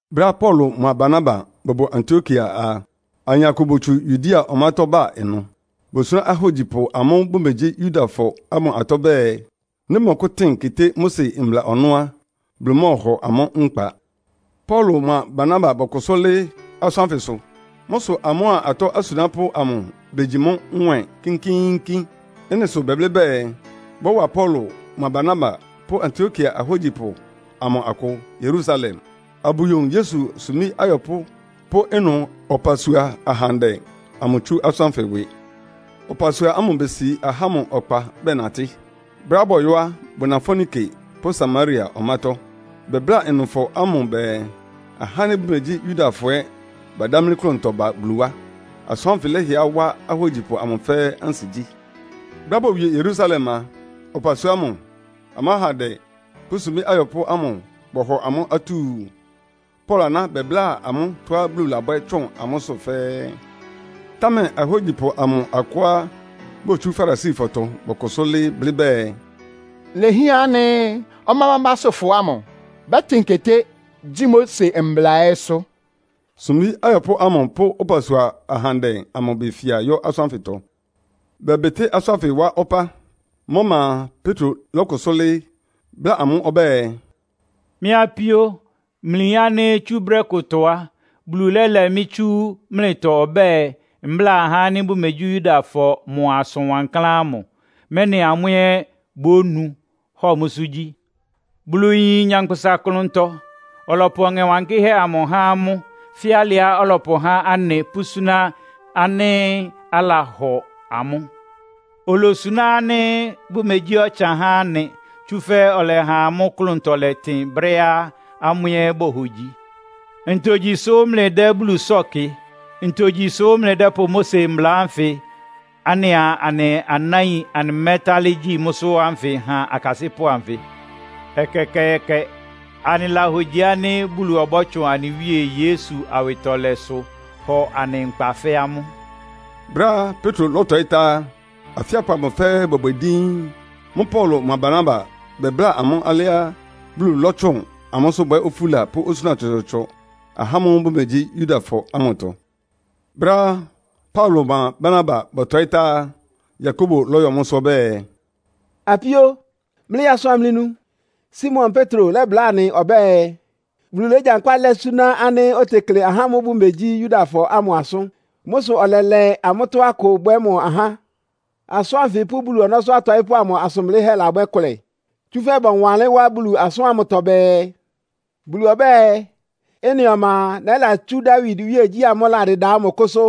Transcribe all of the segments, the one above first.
Brɛ́á Paulo mʋa Barnaba bʋbʋ Antiokia a, ayin akʋ botsu Yudea ɔmátɔ́ ba ɩnʋ. Bosuná ahógyipʋ ámʋ́ʋ́ bʋmegyí Yudafɔ ámʋ atɔ́ bɛɛ, nɩ́ bʋmɔkʋ́tɩ́n keté Mose mbla ɔnɔ́ á, Bulu mɔ́ɔhɔ amʋ́ nkpa. Paulo mʋa Barnaba bɔkʋsʋ́ lɩ́ɩ́ asʋ́n ánfɩsʋ. Mʋ́ sʋ amʋ́a atɔ́ asunápʋ́ amʋ begyi mʋ́ nwɛ́ɛn kínkíínkín. Ɩ́nɩ sʋ bɛblɩ́ bɛɛ, bɔ́wa Paulo mʋa Barnaba pʋ́ Antiokia ahógyipʋ amʋ akʋ Yerusalem, abʋyowun Yesu sumbí ayɔpʋ́ pʋ́ ɩnʋ ɔpasua ahandɛ amʋ tsú asʋ́n ánfɩ ɩwɩ. Ɔpasua ámʋ besi ahá ámʋ ɔkpa bɛnatɩ́. Brɛ́á bɔyɔ́ á, bʋna Foenike pʋ́ Samaria ɔmátɔ́. Bɛbláa ɩnʋfɔ ámʋ bɛɛ, ahá ánɩ́ bʋmegyí Yudafɔ ɛ́ badámlí klʋntɔ ba Bulu wá. Asʋ́n ánfɩ lɛhɩɛ wá ahógyipʋ amʋ fɛ́ɛ́ ansigyí. Brɛ́á bowie Yerusalem a, ɔpasua ámʋ, amʋ́ ahandɛ pʋ́ sumbí ayɔpʋ́ ámʋ bɔhɔ amʋ́ atúu. Paulo aná bɛbláa amʋ́ tɔ́á Bulu labwɛ́ tsʋn amʋ́sʋ́ fɛ́ɛ́. Támɛ ahógyipʋ amʋ akʋá botsú Farisifɔtɔ bɔkʋsʋ́ lɩ́ɩ́ blɩ́ bɛɛ, “Ilehián ánɩ́ ɔmá bámbásʋ́fɔ ámʋ bɛ́tɩn keté, gyi Mose mbla ɛ́sʋ́.” Sumbí ayɔpʋ́ ámʋ pʋ́ ɔpasua ahandɛ amʋ befia yɔ asʋ́n ánfɩtɔ. Bɛbɩtɩ́ asʋ́n ánfɩ wá ɔpá. Mʋ́ ɔma a, Petro lɔ́kʋsʋ́ lɩ́ɩ́, bláa amʋ́ ɔbɛ́ɛ, “Mɩ́ apíó, mlɩyin ánɩ́ tsú brɛ́ kʋtɔ á, Bulu lɛ́lɛ mɩ́ tsú mlɩtɔ ɔbɛ́ɛ, mbláa ahá ánɩ́ bʋmegyí Yudafɔ mʋ asʋn wankláán ámʋ, mɛ́nɩ amʋ́ ɛ́ bónu, hɔ mʋ́sʋ́ gyí. Bulu yín nyankpʋsa klʋntɔ. Ɔlɔpʋ Ɔŋɛ Wankɩ́hɛ́ amʋ há amʋ́, fɛ́ alɩá ɔlɔpʋhá anɩ pʋ́súná ánɩ́ alahɔ amʋ́. Olosuná ánɩ́ bʋmegyí ɔtsan há anɩ, tsúfɛ́ ɔlɛha amʋ́ klʋntɔ lɛtɩn brɛ́á amʋ́ ɛ́ bohogyi. Ntogyi sʋ mlɩdɛ́ Bulu sɔ́ɔ kɩ? Ntogyi sʋ́ mlɩdɛ́pʋ Mose mbla ánfɩ anɩa anɩ anáin anɩmɛ́talɩ́ gyi mʋ́sʋ́ ánfɩ han akasɩ́pʋ́ anfɩ? Ɛkɛkɛɛkɛ! Anɩlahogyi ánɩ́ Bulu ɔbɔ́tsʋn anɩ Wíe Yesu awɩtɔlɛsʋ hɔ anɩ nkpa fɛ́ amʋ́.” Brɛ́á Petro lɔ́tɔɩ́ tá á, afíapʋ amʋ fɛ́ɛ́ bɔbwɛ díín. Mʋ́ʋ́ Paulo mʋa Barnaba bɛbláa amʋ́ alɩá Bulu lɔ́tsʋn amʋ́sʋ́ bwɛ́ ofúla pʋ́ osúna tsɔtsɔɔtsɔ ahá ámʋ́ʋ́ bʋmegyí Yudafɔ ámʋtɔ. Brɛ́á Paulo mʋa Barnaba bɔtɔɩ́ tá á, Yakobo lɔ́yɔ mʋ́sʋ́ ɔbɛ́ɛ, “Apíó, mlɩyaa asʋ amlɩnu. Simon Petro labláa anɩ ɔbɛ́ɛ, Bulu légyankpá lɛ́ súná ánɩ́ otekle ahá ámʋ́ʋ́ bʋmegyí Yudafɔ ámʋ asʋ́n. Mʋ́ sʋ ɔlɛlɛ amʋ́tɔ́ akʋ bwɛ́ mʋ ahá. Asʋ́n ánfɩ pʋ́ Bulu ɔnɔ́sʋ́ atɔɩ́pʋ́ amʋ asʋn blɩ́hɛ́ labwɛ́ kʋlɛ. Tsúfɛ́ bɔwanlɩ́n wá Bulu asʋ́n ámʋtɔ bɛɛ, ‘Bulu ɔbɛ́ɛ. Ɩ́nɩ ɔma a, nɛ́latsú Dawid iwíegyí amʋ́ʋ́ ɩladɩda ámʋ kʋ́sʋ́.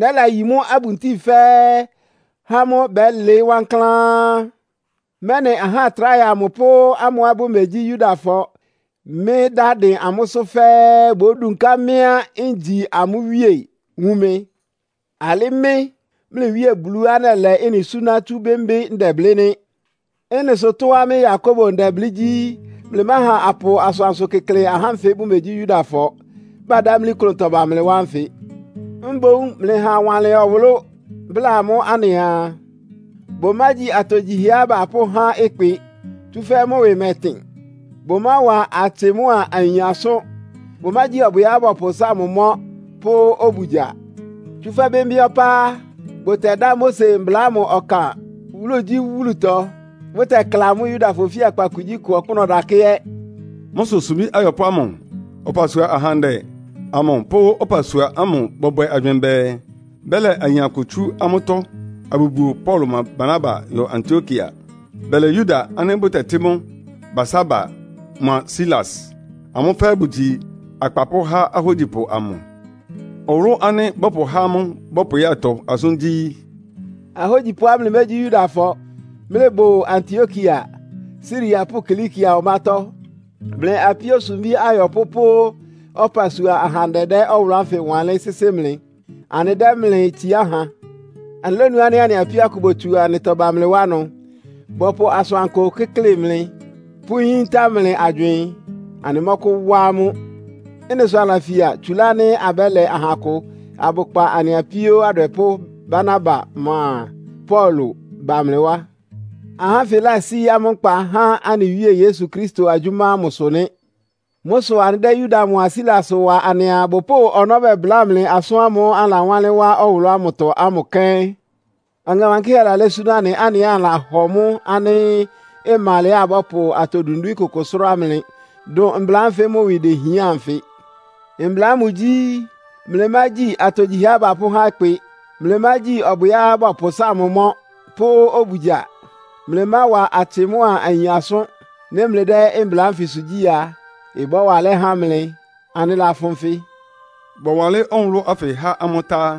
Nɛ́layi mʋ́ abuntíi fɛ́ɛ́, há mʋ́ bɛ́lɩɩ́ wankláán, mɛ́nɩ aha tráhɛ amʋ pʋ́ amʋ́á bʋmegyí Yudafɔ, mɩ́ dá dɩn amʋ́sʋ́ fɛ́ɛ́ bódunká mɩ́á ngyi amʋ́ Wíe, wun mɩ. Alɩ́ mɩ́, mlɩ Wíe Buluá nɛlɛ ɩ́nɩ súná tsú bɩ́mbɩ́ ndɛblɩ́ nɩ́.’ “Ɩ́nɩ sʋ tɔ́á mɩ́ Yakobo ndɛblɩ́ gyí, mlɩmáha apʋ asʋansʋ kɩ́klɩ ahá ánfɩ bʋmegyí Yudafɔ, badámlí klʋntɔ ba Bulu wá ánfɩ. Mboún mlɩha awanlɩn ɔwʋlʋ́ bláa amʋ́ anɩaa, bʋmágyi atogyihɛá bapʋ́há ɩkpɩ, tsúfɛ́ mʋ́ ɩwɩ mɛtɩn. Bʋmáwa atsɩ mʋ́a ayin asʋ́n. Bʋmágyi ɔbwɩá bɔpʋsáa mʋ mɔ́ pʋ́ obugya. Tsúfɛ́ bɩ́mbɩ́ ɔpá á, bʋtɛdá Mose mbla ámʋ ɔkan wúlugyíwúlutɔ, bʋtɛkla mʋ́ Yudafɔ ofíakpa kugyíkʋ ɔkpʋ́nʋ́ ɔdakɛ́ ɛ́.” Mʋ́ sʋ sumbí ayɔpʋ́ ámʋ, ɔpasua ahandɛ amʋ pʋ́ ɔpasua ámʋ bɔbwɛ agywɩɩn bɛɛ, bɛlɛ ayin akʋ tsú amʋ́tɔ́ abʋbuo Paulo mʋa Barnaba yɔ Antiokia. Bɛlɛ Yuda ánɩ́ bʋtɛtɩ́ mʋ Barsaba mʋa Silas. Amʋ́ fɛ́ɛ́ bʋgyi akpapʋ́ há ahógyipʋ amʋ. Ɔwʋlʋ́ ánɩ́ bɔpʋhá amʋ́ bɔpʋyátɔ asʋ́n gyí: “Ahógyipʋá mlɩmégyí Yudafɔ, mlɩbʋ Antiokia, Siria pʋ́ Kilikia ɔmátɔ́. Mlɩ apíó sumbí ayɔpʋ́ pʋ́ ɔpasua ahandɛ dɛ́ ɔwʋlʋ́ ánfɩ wanlɩ́n sɩ́sɩ́ mlɩ. “Anɩdɛ́ mlɩ itsiá ha. “Anɩlónu ánɩ́ anɩ apíó akʋ botsu anɩtɔ ba mlɩ wá ɩnʋ, bɔpʋ asʋankʋ kɩ́klɩ mlɩ, pʋ́yíntá mlɩ agywɩɩn. Anɩmɔ́kʋ́wá amʋ́. Ɩ́nɩ sʋ anɩlafia, tsúlá ánɩ́ abɛ́lɛ aha akʋ abʋkpa anɩ apíó adwɛpʋ́ Barnaba mʋa Paulo ba mlɩ wá. Ahá ánfɩ lásí amʋ́ nkpa há anɩ Wíe Yesu Kristo agyʋ́má ámʋ sʋ nɩ́. Mʋ́ sʋ anɩdɛ́ Yuda mʋa Silas wa anɩaa, bʋpʋ́ʋ ɔnɔ́ bɛbláa mlɩ asʋ́n ámʋ́ʋ́ anɩlawánlɩ́n wá ɔwʋlʋ́ ámʋtɔ ámʋ kɛ́n. Ɔŋɛ Wankɩ́hɛ́ lalɛ́ súná anɩ, anɩ ɛ́ anɩlahɔ mʋ́ ánɩ́ ɩma alɛá abɔ́pʋ atɔ dwindwín kʋkʋ sʋ́rá mlɩ, dʋn mbla ánfɩ mʋ́ ɩwɩ dehián anfɩ. Mbla ámʋ gyí, ‘Mlɩmágyi atogyihɛá bapʋ́há ɩkpɩ. Mlɩmágyi ɔbwɩá bɔpʋsáa mʋ mɔ́ pʋ́ obugya. Mlɩmáwa atsɩ mʋ́a ayin asʋ́n.’ “Nɩ́ mlɩdɛ́ mbla ánfɩsʋ gyi a, ɩbɔ́wa alɛ́ há mlɩ. Anɩlafʋn nfɩ.” Bɔwanlɩ́n ɔwʋlʋ́ ánfɩ há amʋ́ tá á,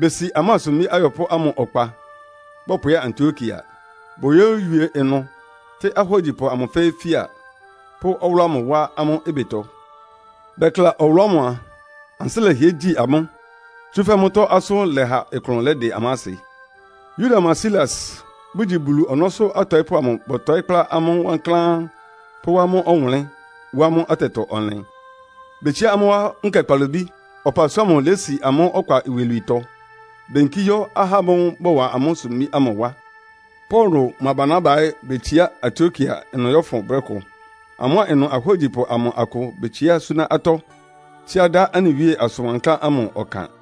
besi amʋ́a sumbí ayɔpʋ́ ámʋ ɔkpa bɔpʋya Antiokia. Boyówie ɩnʋ tɩ́ ahógyipʋ amʋ fɛ́ɛ́ fía, pʋ́ ɔwʋlʋ́ ámʋ wá amʋ́ ɩbɩtɔ. Bɛkla ɔwʋlʋ́ ámʋ a, ansɩ́ lɛhɩɛ gyi amʋ́, tsúfɛ́ mʋ́tɔ́ asʋ́n lɛha klʋn lɛ́dɩ amʋ́ asɩ. Yuda mʋa Silas, bʋgyi Bulu ɔnɔ́sʋ́ atɔɩ́pʋ́ amʋ bɔtɔɩ́ kplá amʋ́ wankláán pʋ́wá amʋ́ ɔwʋnlɩ́n, wá amʋ́ atɛtɔ-ɔnlɩn. Betsiá amʋ́ wá nkɛ kpalobí, ɔpasua ámʋ lési amʋ́ ɔkpa iwilwiitɔ, beyinkí yɔ́ ahá ámʋ́ʋ́ bɔwa amʋ́ sumbí ámʋ wá. Paulo mʋa Barnaba ɛ́ betsiá Antiokia ɩnʋ yɔ́fʋn brɛ́ kʋ. Amʋ́a ɩnʋ ahógyipʋ amʋ akʋ betsiá súná atɔ́, tsíá dá anɩ Wíe asʋn wankláán ámʋ ɔkan.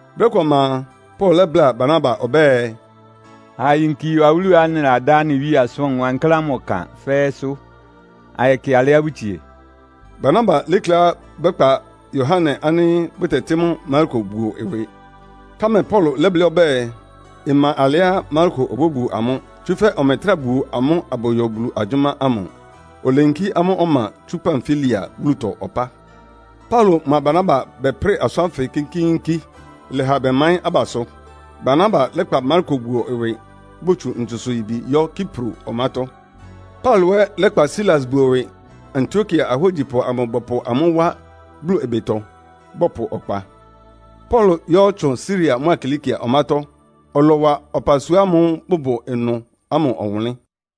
Brɛ́ kʋ ɔma a, Paulo lɛ́bláa Barnaba ɔbɛ́ɛ, “Ha ayinki yɔ awúluá anɩladá anɩ Wíe asʋn wankláán ámʋ ɔkan fɛ́ɛ́sʋ́, ayɛkɩ alɩá bʋtsie.” Barnaba lékléá bɛ́kpa Yohane ánɩ́ bʋtɛtɩ́ mʋ Marko buo ɩwɩ. Támɛ Paulo lɛ́blɩ́ ɔbɛ́ɛ, ɩma alɛá Marko obóbuo amʋ́, tsúfɛ́ ɔmɛtrá buo amʋ́ abʋyɔ Bulu agyʋ́má ámʋ. Oleyinkí amʋ́ ɔma tsú Pamfilia wúlutɔ ɔpá. Paulo mʋa Barnaba bɛprɩ́ɩ asʋ́n ánfɩ kínkíínkín, ɩlɛha bɛmaɩ́n abasʋ. Barnaba lɛ́kpa Marko buo ɩwɩ, botsu ntsusʋ-yibi yɔ́ Kipro ɔmátɔ́. Paulo ɛ́ lɛ́kpa Silas buo ɩwɩ, Antiokia ahógyipʋ amʋ bɔpʋ amʋ́ wá Bulu ɩbɩtɔ, bɔpʋ ɔkpa. Paulo lɔ́yɔtsʋn Siria mʋ́a Kilikia ɔmátɔ́; ɔlɔwa ɔpasua ámʋ́ʋ́ ɩbʋbʋ ɩnʋ ámʋ ɔwʋnlɩ́n.